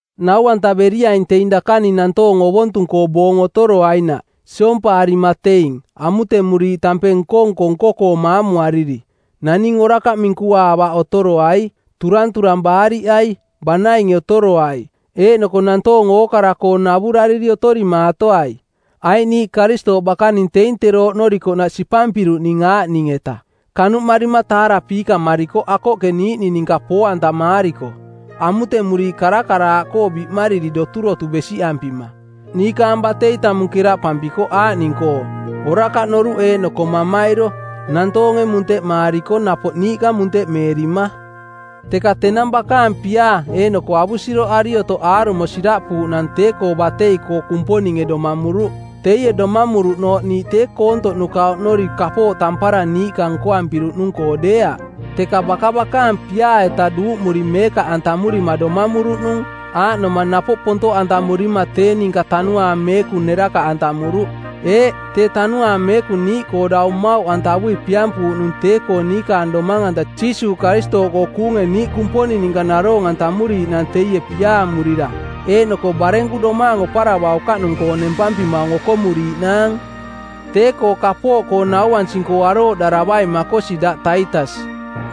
Nau-antaveriaing teing dakaning nantoong ovontung-koo boong otoroainaꞌ, siompaarima teing, amutemuriiꞌ tampeng nko-nko nko-koo maamuariri. Naning orakaꞌ minkuaavaꞌ otoroai, turanturang baariꞌai, banainge otoroai, eeꞌnoko nantoong ookara-koo navurariri otorimaatoai. Aiꞌ niiꞌ Karistooꞌ bakaning teing tero oꞌnorikoꞌnaꞌ sipampiruꞌning aaꞌning-eta: kanuꞌmarima taarapiikamarikoꞌ akoꞌke niiꞌning ninka poo-antamaariko, amutemuriiꞌ karakaraaꞌkoo biꞌmariri doturotu besiꞌampima. Niikaang batei tamung keraꞌpampikoꞌ aaꞌning-koo: orakaꞌ noruꞌ eeꞌnoko mamairo, nantoonge munteꞌmaariko napoꞌ niiꞌka munteꞌmeerima. Teka tenang bakaang piaa eeꞌnoko avusiroꞌari otoꞌ aarumo siraꞌpuuꞌnang tee-koo batei-koo Kumponinge domamuruꞌ. Teie domamuruꞌnooꞌ niiꞌ tee koontoꞌnuka oꞌnori kapooꞌ tampara niiꞌka nkoampiruꞌnung-koo deeaꞌ, teka baka bakaang piaa-eta duuꞌmuri meekaꞌantamurima domamuruꞌnung, aaꞌnoma napoꞌ pontoꞌantamurima tee ninka Tanuaang Meekung nerakaꞌantamuruꞌ. Eeꞌ, tee Tanuaang Meekung niiꞌkoo dau mmauꞌantavui piampuuꞌnung tee-koo niikaang domang-anta Jiisuuꞌ Karistooꞌkoo kuunge niiꞌ Kumponing ninka naroong-antamuriiꞌnaang teie piaamurira, eeꞌnoko barenku domaang oparavaukaꞌnung-koong nempampimaung okomuriiꞌnaang. Tee-koo kapooꞌkoo nauansing-koo arooꞌdaravaing makosi daꞌ Taitas.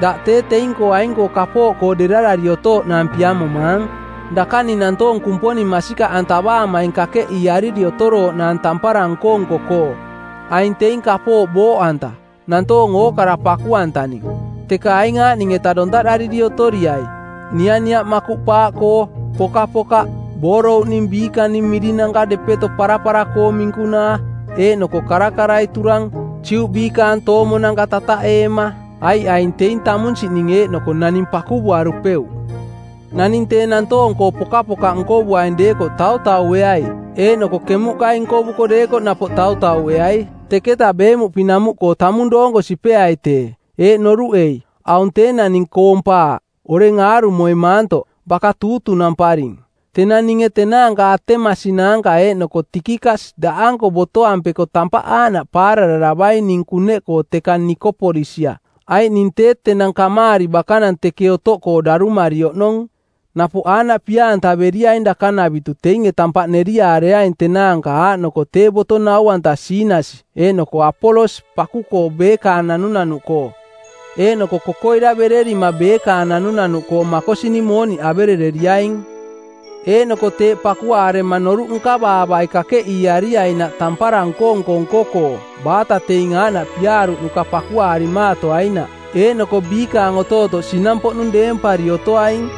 Daꞌ tee teing-koo aing-koo kapooꞌkoo derarari otooꞌnaang piamomaang, dakaning nantoong Kumponing masikaꞌantavaamaing kakeꞌiiariri otorooꞌnaang tampara nko-nko-koo. Aing teing kapooꞌ booꞌanta, nantoong ookara paku-antaning. Teka aing aaꞌning-eta dontaꞌdariri otoriai: nianiaꞌ makuꞌpaaꞌkoo, pokapokaꞌ, boorouꞌning biikaning mirinanka depeto parapara-koong minkunaa, eeꞌnoko karakarai turang, Juꞌ biikaang toomonanka tataꞌeema. Aiꞌ aing teing tamunsiꞌning eeꞌnoko naning pakuvuarupeuꞌ. Naning tee nantoong-koo pokapokaꞌ nkovuaing deekoꞌ tautaueai eeꞌnoko kemuꞌkai nkovuko deekoꞌ napoꞌ tautaueai; Teketa beemuꞌpinamuꞌkoo tamung doonko sipeai tee, eeꞌ noruꞌei: Aung tee naning koompaaꞌ, oreng aarumoi maantoꞌ, baka tuutunamparing. Tenang ninge tenaanka Atemasi naanka eeꞌnoko Tikikas daꞌanko botoampeko tampaꞌ aaꞌnaꞌ paarararavaing ning kuneꞌkoo teka Nikopolisia, aiꞌ ning tee tenang kamaari bakanang teke otoꞌkoo darumari oꞌnong. Napoꞌ aaꞌnaꞌ pia-antaveriaing dakanavitu teinge tampaꞌ neriaareaing tenaanka aaꞌnoko tee boto nau-anta Siinasi eeꞌnoko Apolos paku-koo beekaang nanunanuꞌkoo. Eeꞌnoko kokoiravererima beekaang nanunanuꞌkoo makosining mooniꞌ averereriaing. Eeꞌnoko teeꞌ pakuaarema noruꞌ nkavaavai kakeꞌiiariainaꞌ tampara nko-nko nko-koo, baata teing aaꞌnaꞌ piaaruꞌnuka pakuaarimaatoainaꞌ, eeꞌnoko biikaang otootoꞌ sinampoꞌnung deempari otoaing.